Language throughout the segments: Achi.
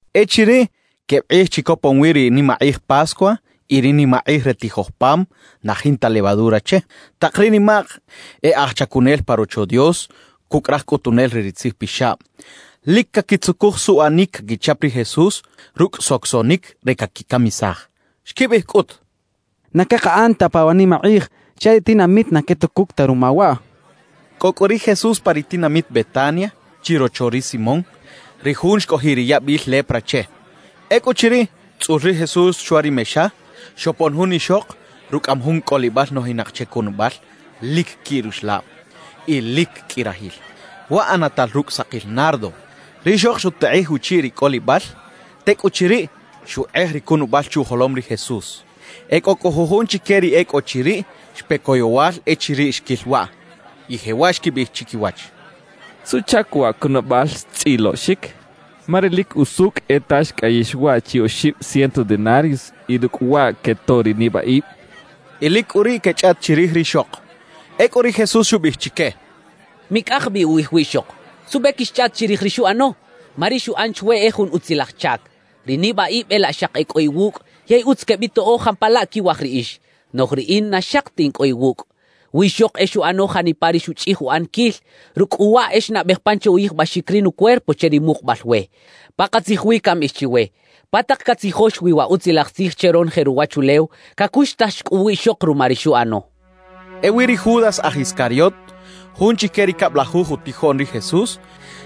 Echiriꞌ queb kꞌij chi copon wi ri nimakꞌij Pascua y ri nimakꞌij re tijoj pam na jinta levadura che, tak ri nimak e aj chacunel pa Rocho Dios cucꞌ raj cꞌutunel re ri tzijpixab, lic caquitzucuj suꞌanic caquichap ri Jesús rucꞌ socosoꞌnic re caquicamisaj. Xquibiꞌij cꞌut: «Na cakaꞌan ta pa wa nimakꞌij chaꞌ ri tinamit na quetucuc ta ruma waꞌ» xechaꞌ. Cꞌo cꞌu ri Jesús pa ri tinamit Betania chirocho ri Simón, ri jun xcꞌojiꞌ ri yabil lepra che. Ecꞌuchiriꞌ tzꞌul ri Jesús chwa ri mexa, xopon jun ixok rucꞌaꞌam jun cꞌolibal nojinak che cunabal lic quiꞌ ruxlab y lic qꞌui rajil, waꞌ ꞌanatal rucꞌ sakil nardo. Rixok xutekꞌij uchiꞌ ri cꞌolibal; tecꞌuchiriꞌ, xukꞌej ri cunabal chuꞌjolom ri Jesús. E cꞌo cꞌu jujun chique ri e cꞌo chiriꞌ xpe coyowal echiriꞌ xquil waꞌ, y jewaꞌ xquibiꞌij chiquiwach: —¿Suꞌchac wa cunabal xtzꞌiloꞌxic? Ma ri lic usucꞌ e ta xcꞌayix waꞌ chi oxib ciento denarios, y rucꞌ waꞌ quetoꞌ ri nibaꞌib —xechaꞌ. Y lic cꞌu riꞌ quechꞌaꞌt chirij rixok. Ecꞌu ri Jesús xubiꞌij chique: —Micꞌak bi ukꞌij wiꞌxok. ¿Suꞌbe quixchꞌaꞌt chirij ri xuꞌano? Ma ri xuꞌan chwe e jun utzilaj chac. Ri nibaꞌib e laꞌ xaki e cꞌo iwucꞌ yey utz quebitoꞌo jampalaꞌ quiwaj riꞌix, noꞌj riꞌin na xaki ta in cꞌo iwucꞌ. Wiꞌxok e xuꞌano janipa ri xuchꞌij uꞌaniquil; rucꞌ cꞌu waꞌ e xnabej pan che uyijbaxic ri nucuerpo che ri mukubal we. Pakatzij wi cambiꞌij chiwe: Pa tak catzijox wi wa Utzilaj Tzij che ronoje ruwachulew, cacuxtax cꞌu wiꞌxok ruma ri xuꞌano —xchaꞌ. Ewi ri Judas aj Iscariot, jun chique ri cablajuj utijoꞌn ri Jesús,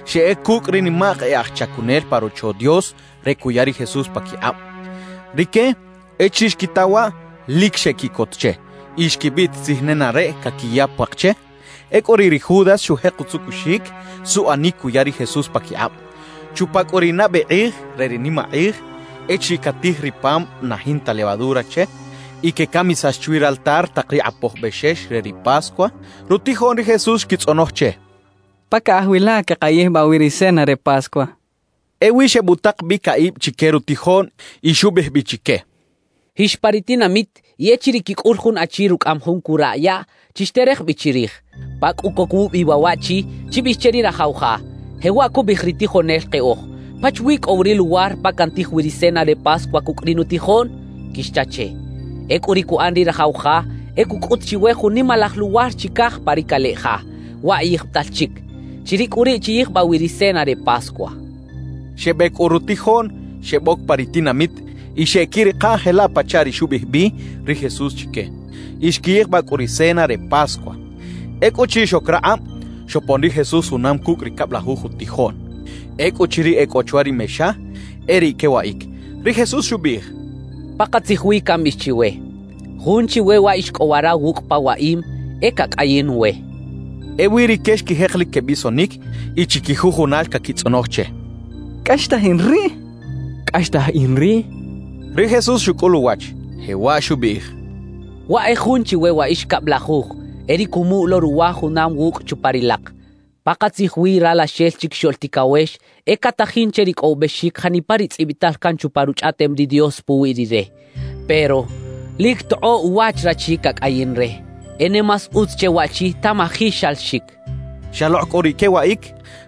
xeꞌec cucꞌ ri nimak e aj chacunel pa Rocho Dios re cuya ri Jesús paquikꞌab. Rique, echiriꞌ xquita waꞌ, lic xequiꞌcot che y xquibiꞌtisij nenareꞌ caquiya puak che. Ecꞌu riꞌ ri Judas xujek utzucuxic suꞌanic cuya ri Jesús paquikꞌab. Chupa cꞌu ri nabe kꞌij re ri nimakꞌij echiriꞌ catij ri pam na jinta levadura che y quecamisax chwi raltar tak ri kꞌapoj bexex re ri Pascua, rutijoꞌn ri Jesús xquitzꞌonoj che: —¿Pa caꞌaj wi la queꞌkayijbaꞌ wi ri cena re Pascua? —xechaꞌ. Ewi xebutak bi caꞌib chique rutijoꞌn y xubiꞌij bi chique: —Jix pa ri tinamit y echiriꞌ quicꞌul jun achi rucꞌaꞌam jun curaꞌ yaꞌ, chixterej bi chirij. Pa cꞌu coc wubi waꞌ waꞌchi, chibiꞌij che ri rajaw ja: “Jewaꞌ cubiꞌij ri tijonel keꞌoj: ¿Pachawi cꞌo wi ri luwar pa cantij wi ri cena re Pascua cucꞌ ri nutijoꞌn?” quixcha che. Ecꞌu ri cuꞌan ri rajaw ja e cucꞌut chiwe jun nimalaj luwar chicaj pa ri caleꞌ ja, waꞌ yijbital chic. Chiriꞌ cꞌu riꞌ chiyijbaꞌ wi ri cena re Pascua —xchaꞌ. Xebec cꞌu rutijoꞌn, xeboc pa ri tinamit y xeꞌquirikaꞌ jelaꞌ pachaꞌ ri xubiꞌij bi ri Jesús chique. Y xquiyijbaꞌ cꞌu ri cena re Pascua. Ecꞌuchiriꞌ xoc rakꞌab, xopon ri Jesús junam cucꞌ ri cablajuj utijoꞌn. Ecꞌuchiriꞌ e cꞌo chwa ri mexa, e riꞌ quewaꞌic, ri Jesús xubiꞌij: —Pakatzij wi cambiꞌij chiwe: Jun chiwe wa ix cꞌo wara wucꞌ pa waꞌim, e cacꞌayin we —xchaꞌ. Ewi rique xquijek lic quebisonic y chiquijujunal caquitzꞌonoj che: —¿Cꞌaxtaj in riꞌ? —cacha jun. —¿Cꞌaxtaj in riꞌ? —cacha jun chic. Ri Jesús xucꞌul uwach; jewaꞌ xubiꞌij: —Waꞌ e jun chiwe wa ix cablajuj, e ri cumuꞌ lo ruwa junam wucꞌ chupa ri lak. Pakatzij wi Ralaxel Chiquixoꞌl Ticawex e catajin che ricꞌowibexic janipa ri tzꞌibital can chupa Ruchꞌaꞌtem ri Dios puwi Rire. Pero ¡lic cꞌu tokꞌoꞌ uwach rachi cacꞌayin re! E ne más utz che waꞌchi tamaji xalaxic —xchaꞌ. Xalokꞌ cꞌu riꞌ quewaꞌic,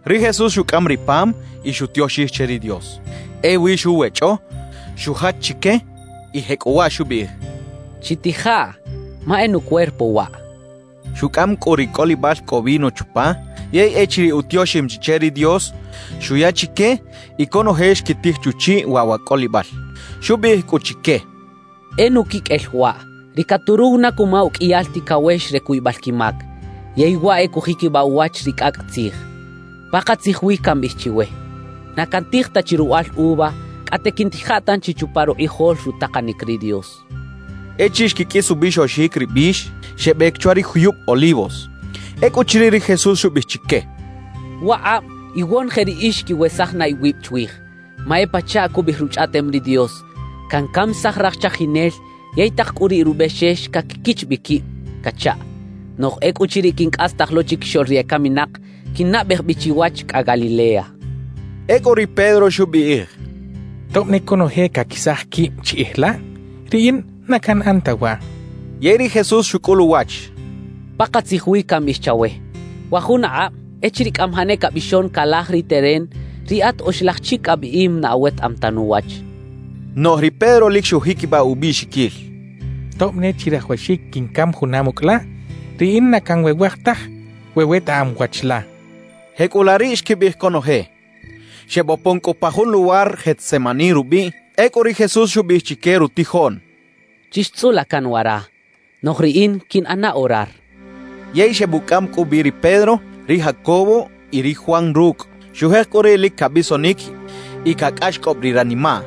ri Jesús xucꞌam ri pam y xutioxij che ri Dios. Ewi xuwechꞌo, xujach chique y jecꞌuwaꞌ xubiꞌij: —Chitijaꞌ, ma e nucuerpo waꞌ —xchaꞌ. Xucꞌam cꞌu ri cꞌolibal cꞌo vino chupa, yey echiriꞌ utioxim chi che ri Dios, xuya chique y conoje xquitij chuchiꞌ waꞌ wa cꞌolibal. Xubiꞌij cꞌu chique: —E nuquiqꞌuel waꞌ, ri caturuw na cuma uqꞌuiyal ticawex re cuybal quimac, yey waꞌ e cujiquibaꞌ uwach ri cꞌacꞌ tzij. Pakatzij wi cambiꞌij chiwe: Na cantij ta chi ruwaꞌal uva, cꞌate quiꞌntija tanchi chupa rukꞌijol rutakanic ri Dios —xchaꞌ. Echiriꞌ xquiqꞌuis ubixoxic ri bix, xebec chwa ri juyub Olivos. Ecꞌuchiriꞌ ri Jesús xubiꞌij chique: —Wakꞌab iwonoje riꞌix quiwesaj na iwib chwij, ma e pachaꞌ cubiꞌij Ruchꞌaꞌtem ri Dios: Cancamisaj raj chajinel yey tak cꞌu riꞌ rubexex caquiquich bi quib cachaꞌ. Noꞌj ecꞌuchiriꞌ quincꞌastaj lo chiquixoꞌl ri ecaminak, quinnabej bi chiwach cꞌa Galilea —xchaꞌ. Ecꞌu ri Pedro xubiꞌij: —Tob ne conoje caquesaj quib chiꞌij la, riꞌin na canꞌan ta waꞌ —xchaꞌ. Yey ri Jesús xucꞌul uwach: —Pakatzij wi cambiꞌij chawe: Wa jun akꞌab, echiriꞌ cꞌamajaꞌ ne cabixon calaj ri teren, riꞌat oxlaj chic abiꞌim na awetaꞌam ta nuwach —xchaꞌ. Noꞌj ri Pedro lic xujiquibaꞌ ubiꞌxiquil: —Tob ne chirajawaxic quincam junam ucꞌ la, riꞌin na canwewaj taj we wetaꞌam wach la —xchaꞌ. Jecꞌulaꞌ riꞌ xquibiꞌij conoje. Xebopon cꞌu pa jun luwar Getsemaní rubiꞌ. Ecꞌu ri Jesús xubiꞌij chique rutijoꞌn: —Chixtzꞌula can wara, noꞌj riꞌin quiꞌnꞌana orar —xchaꞌ. Yey xebucꞌam cꞌu bi ri Pedro, ri Jacobo y ri Juan rucꞌ. Xujek cꞌu riꞌ lic cabisonic y cacꞌaxcꞌob ri ranimaꞌ.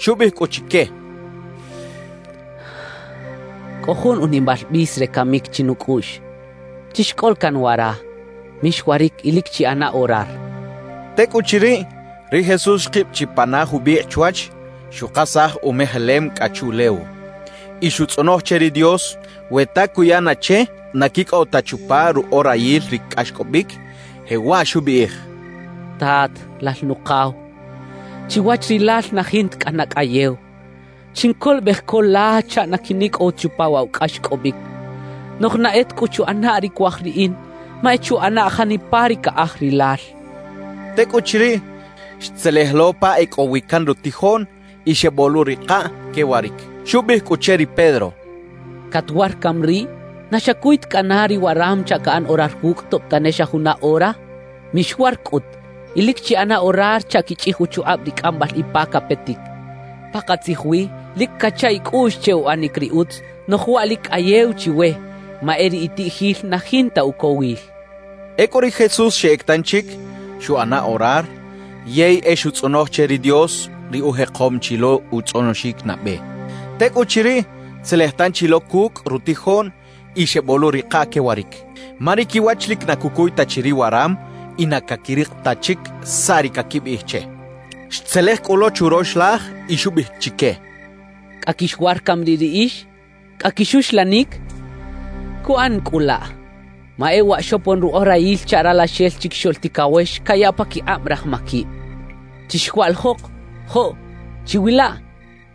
Xubiꞌij cꞌu chique: —Cꞌo jun unimal bis re camic chinucꞌuꞌx. Chixcꞌola can wara; mixwaric y lic chiꞌana orar —xchaꞌ. Tecꞌuchiriꞌ, ri Jesús xkib chi pana jubikꞌ chwach, xukasaj umejelem cꞌa chuꞌlew, y xutzꞌonoj che ri Dios we ta cuya na che na quicꞌow ta chupa ruꞌorayil ri cꞌaxcꞌobic, jewaꞌ xubiꞌij: «Tat, Lal Nukaw, chiwach Rilal na jinta cꞌana cꞌayew; chincolobej co la chaꞌ na quinicꞌow ta chupa waꞌ wa cꞌaxcꞌobic. Noꞌj na e ta cꞌu chuꞌana ri cuaj riꞌin, ma e chuꞌanaꞌ janipa ri caꞌaj Rilal» xchaꞌ. Tecꞌuchiriꞌ, xtzelej lo pa e cꞌo wi can rutijoꞌn y xeboꞌluꞌrikaꞌ quewaric. Xubiꞌij cꞌu che ri Pedro: —¿Catwar cami riꞌ? ¿Na xacuy ta cꞌana ri waram chaꞌ caꞌan orar wucꞌ, tob tane xa juna ora? Mixwar cꞌut, y lic chiꞌana orar chaꞌ quichꞌij uchukꞌab ri cꞌambal ipa capetic. Pakatzij wi, lic cacha icꞌuꞌx che uꞌanic ri utz, noꞌj waꞌ lic cꞌayew chiwe ma e ri itiꞌjil na jinta ucowil —xchaꞌ. Ecꞌu ri Jesús xeꞌec tanchic, xuꞌana orar, yey e xutzꞌonoj che ri Dios ri ujekom chi lo utzꞌonoxic nabe. Tecꞌuchiriꞌ, xtzelej tanchi lo cucꞌ rutijoꞌn y xeboꞌluꞌrikaꞌ quewaric; ma ri quiwach lic na cucuy ta chi ri waram y na caquirik ta chic saꞌ ri caquibiꞌij che. Xtzelej cꞌu lo churox laj y xubiꞌij chique: —¿Cꞌa quixwar cami riꞌ riꞌix? ¿Cꞌa quixuxlanic? ¡Cuꞌan na cꞌu laꞌ! Ma e waꞌ xopon ruꞌorayil chaꞌ Ralaxel Chiquixoꞌl Ticawex cayaꞌ paquikꞌab raj maquib. ¡Chixwaꞌlijok! ¡Joꞌ! Chiwilaꞌ,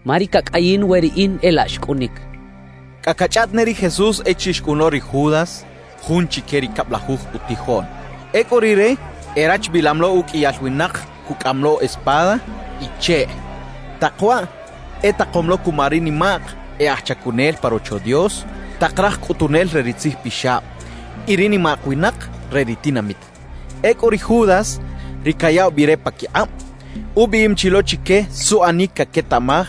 ma ri cacꞌayin we riꞌin e laꞌ xcꞌunic —xchaꞌ. Cꞌa cachꞌaꞌt ne ri Jesús echiriꞌ xcꞌun lo ri Judas, jun chique ri cablajuj utijoꞌn. Ecꞌu rire erachbilam lo uqꞌuiyal winak cucꞌaꞌam lo espada y cheꞌ. Tak waꞌ etakom lo cuma ri nimak e aj chacunel pa Rocho Dios, tak raj cꞌutunel re ri tzijpixab y ri nimak winak re ri tinamit. Ecꞌu ri Judas, ri cayaꞌw bi re paquikꞌab, ubiꞌim chi lo chique suꞌanic caquetaꞌmaj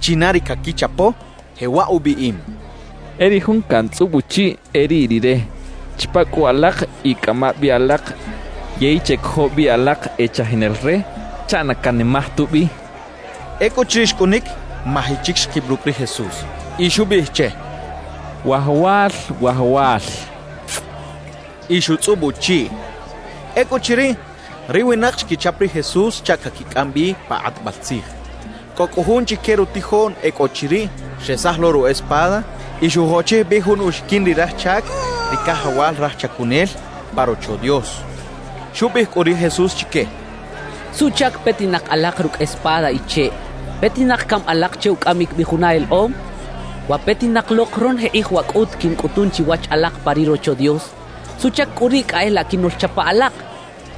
china ri caquichapo, jewaꞌ ubiꞌim: «E ri jun cantzꞌub uchiꞌ, e riꞌ rire. Chapa cꞌu alak y cꞌama bi alak, yey checojo bi alak e chajinel re chaꞌ na canimaj tubi» xchaꞌ. Ecꞌuchiriꞌ xcꞌunic, maji chic xkib rucꞌ ri Jesús y xubiꞌij che: —¡Wajawal, Wajawal! —xcha che. Y xutzꞌub uchiꞌ. Ecꞌuchiriꞌ, ri winak xquichap ri Jesús chaꞌ caquicꞌam bi pa kꞌatbal tzij. Cꞌo cꞌu jun chique rutijoꞌn e cꞌo chiriꞌ, xresaj lo ru espada y xujochij bi jun uxiquin ri raj chac ri cajawal raj chacunel pa Rocho Dios. Xubiꞌij cꞌu ri Jesús chique: —¿Suꞌchac petinak alak rucꞌ espada y cheꞌ? ¿Petinak cami alak che ucꞌamic bi juna elekꞌom? Wa petinak lok ronoje kꞌij waꞌ cꞌut quincꞌutun chiwach alak pa ri Rocho Dios. ¿Suꞌchac cꞌu riꞌ cꞌa e laꞌ quinoꞌlchapa alak?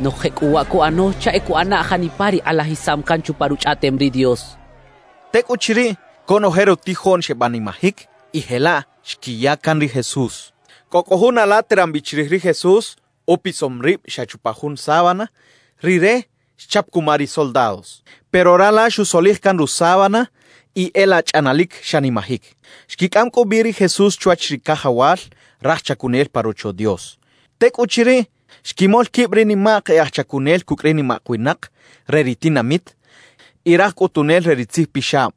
Noꞌj jecꞌuwaꞌ cuꞌano chaꞌ e cuꞌana janipa ri kꞌalajisam can chupa Ruchꞌaꞌtem ri Dios —xcha chique. Tecꞌuchiriꞌ, conoje rutijoꞌn xebanimajic y jelaꞌ xquiya can ri Jesús. Cꞌo cꞌu jun ala teran bi chirij ri Jesús, upisom rib xa chupa jun sábana; rire xchap cuma ri soldados. Pero rala xusolij can rusábana y e laꞌ chꞌanalic xanimajic. Xquicꞌam cꞌu bi ri Jesús chwach ri cajawal raj chacunel pa Rocho Dios. Tecꞌuchiriꞌ, xquimol quib ri nimak e aj chacunel cucꞌ ri nimak winak re ri tinamit y raj cꞌutunel re ri tzijpixab.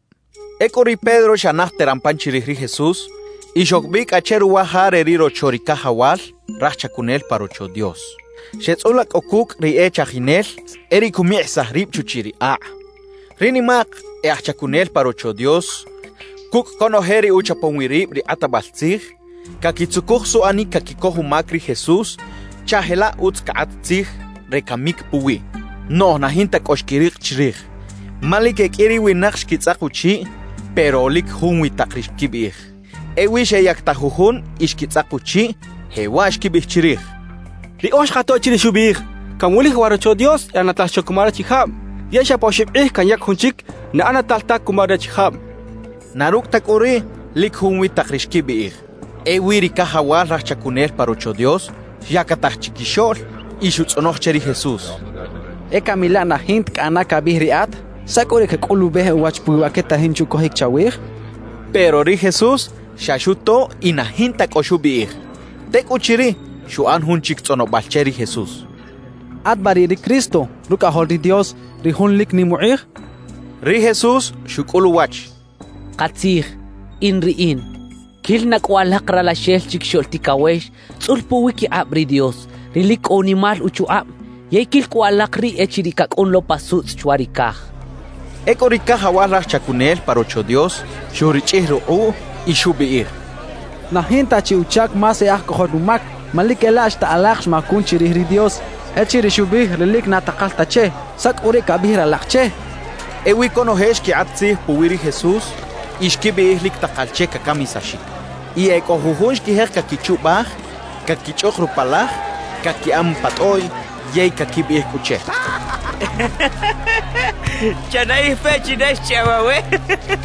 Ecꞌu ri Pedro xa naj teran pan chirij ri Jesús y xoc bi cꞌa che ruwa ja re ri rocho ri cajawal raj chacunel pa Rocho Dios. Xeꞌtzꞌula cꞌu cucꞌ ri e chajinel, e riꞌ cumikꞌisaj rib chuchiꞌ ri akꞌ. Ri nimak e aj chacunel pa Rocho Dios cucꞌ conoje ri uchapom wi rib ri kꞌatbal tzij, caquitzucuj suꞌanic caquicoj umac ri Jesús chaꞌ jelaꞌ utz cakꞌat tzij re camic puwiꞌ, noꞌj na jinta cꞌo xquirik chirij. Ma lic e qꞌui ri winak xquitzꞌak uchiꞌ, pero lic junwi tak ri xquibiꞌij. Ewi xeyactaj jujun y xquitzꞌak uchiꞌ, jewaꞌ xquibiꞌij chirij: —Riꞌoj xkato echiriꞌ xubiꞌij: “Canwulij wa Rocho Dios ꞌanatal xa cuma rachijab, yey xa pa oxib kꞌij canyac jun chic na ꞌanatal ta cuma rachijab” —xechaꞌ. Na rucꞌ ta cꞌu riꞌ, lic junwi tak ri xquibiꞌij. Ewi ri cajawal raj chacunel pa Rocho Dios xyactaj chiquixoꞌl y xutzꞌonoj che ri Jesús: —¿E cami laꞌ na jinta cꞌana cabiꞌij riꞌat? ¿Saꞌ cꞌu ri cacꞌulubej uwach puwi wa quetajin che ucojic chawij? —xchaꞌ. Pero ri Jesús xa xuto y na jinta cꞌo xubiꞌij. Tecꞌuchiriꞌ, xuꞌan jun chic tzꞌonobal che ri Jesús: —¿At ba riꞌ ri Cristo, Rucꞌajol ri Dios, ri Jun lic nim ukꞌij? —xcha che. Ri Jesús xucꞌul uwach: —Katzij, “In Riꞌin.” Quil na cꞌu alak Ralaxel Chiquixoꞌl Ticawex tzꞌul puwiquikꞌab ri Dios, ri lic cꞌo unimal uchukꞌab yey quil cꞌu alak riꞌ echiriꞌ cacꞌun lo pa sutzꞌ chwa ri caj —xchaꞌ. Ecꞌu ri cajawal raj chacunel pa Rocho Dios xurichꞌij rukꞌuꞌ y xubiꞌij: —¡Na jinta chi uchac más e aj cojol umac! Ma lic e laꞌ xta alak xmacun chirij ri Dios echiriꞌ xubiꞌij ri lic na takal ta che. ¿Saꞌ cꞌu riꞌ cabiꞌij ralak che? —xchaꞌ. Ewi conoje xquikꞌat tzij puwi ri Jesús y xquibiꞌij lic takal che cacamisaxic. Y e cꞌo jujun xquijek caquichubaj; caquichꞌuk rupalaj, caquiꞌan pa tꞌoꞌy yey caquibiꞌij cꞌu che: —Chanaꞌij peꞌ china xchꞌayaw awe —quecha che.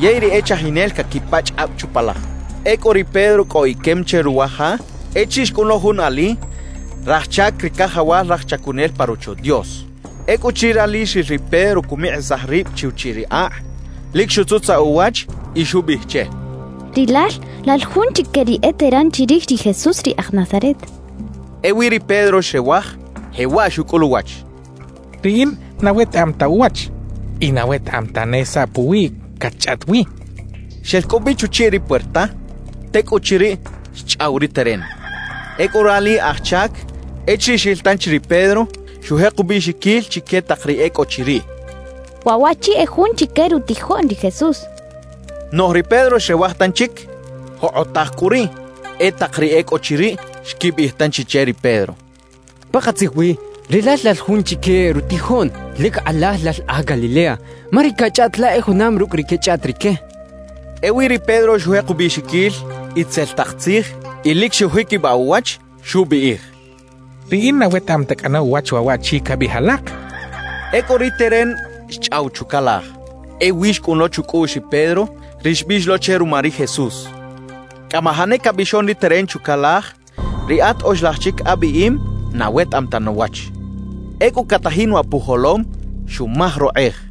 Yey ri e chajinel caquipachꞌ kꞌab chupalaj. Ecꞌu ri Pedro cꞌo iquem che ruwa ja echiriꞌ xcꞌun lo jun ali raj chac ri cajawal raj chacunel pa Rocho Dios. Ecꞌuchiriꞌ rali xril ri Pedro cumikꞌisaj rib chuchiꞌ ri akꞌ, lic xutzutzaꞌ uwach y xubiꞌij che: —Rilal lal jun chique ri eteran chirij ri Jesús ri aj Nazaret —xcha che. Ewi ri Pedro xrewaj, jewaꞌ xucꞌul uwach: —Riꞌin na wetaꞌam ta uwach y na wetaꞌam tane saꞌ puwiꞌ catchꞌaꞌt wi —xchaꞌ. Xel cꞌu bi chuchiꞌ ri puerta. Tecꞌuchiriꞌ, xchꞌaw ri teren. Ecꞌu rali aj chac echiriꞌ xril tanchi ri Pedro, xujek ubiꞌxiquil chique tak ri e cꞌo chiriꞌ: —Waꞌ waꞌchi e jun chique rutijoꞌn ri Jesús —xchaꞌ. Noꞌj ri Pedro xrewaj tanchic. Jokꞌotaj cꞌu riꞌ, e tak ri e cꞌo chiriꞌ xquibiꞌij tanchi che ri Pedro: —Pakatzij wi rilal lal jun chique rutijoꞌn; lic kꞌalaj lal aj Galilea, ma ri cachꞌaꞌt la e junam rucꞌ ri quechꞌaꞌt rique —xechaꞌ. Ewi ri Pedro xujek ubiꞌxiquil itzel tak tzij y lic xujiquibaꞌ uwach, xubiꞌij: —Riꞌin na wetaꞌam ta cꞌana uwach waꞌ waꞌchi cabiꞌij alak —xchaꞌ. Ecꞌu ri teren xchꞌaw chucalaj. Ewi xcꞌun lo chucꞌuꞌx ri Pedro ri xbiꞌx lo che ruma ri Jesús: «Cꞌamajaꞌ ne cabixon ri teren chucalaj, riꞌat oxlaj chic abiꞌim na awetaꞌam ta nuwach.» Ecꞌu catajin waꞌ pujolom, xumaj rokꞌej.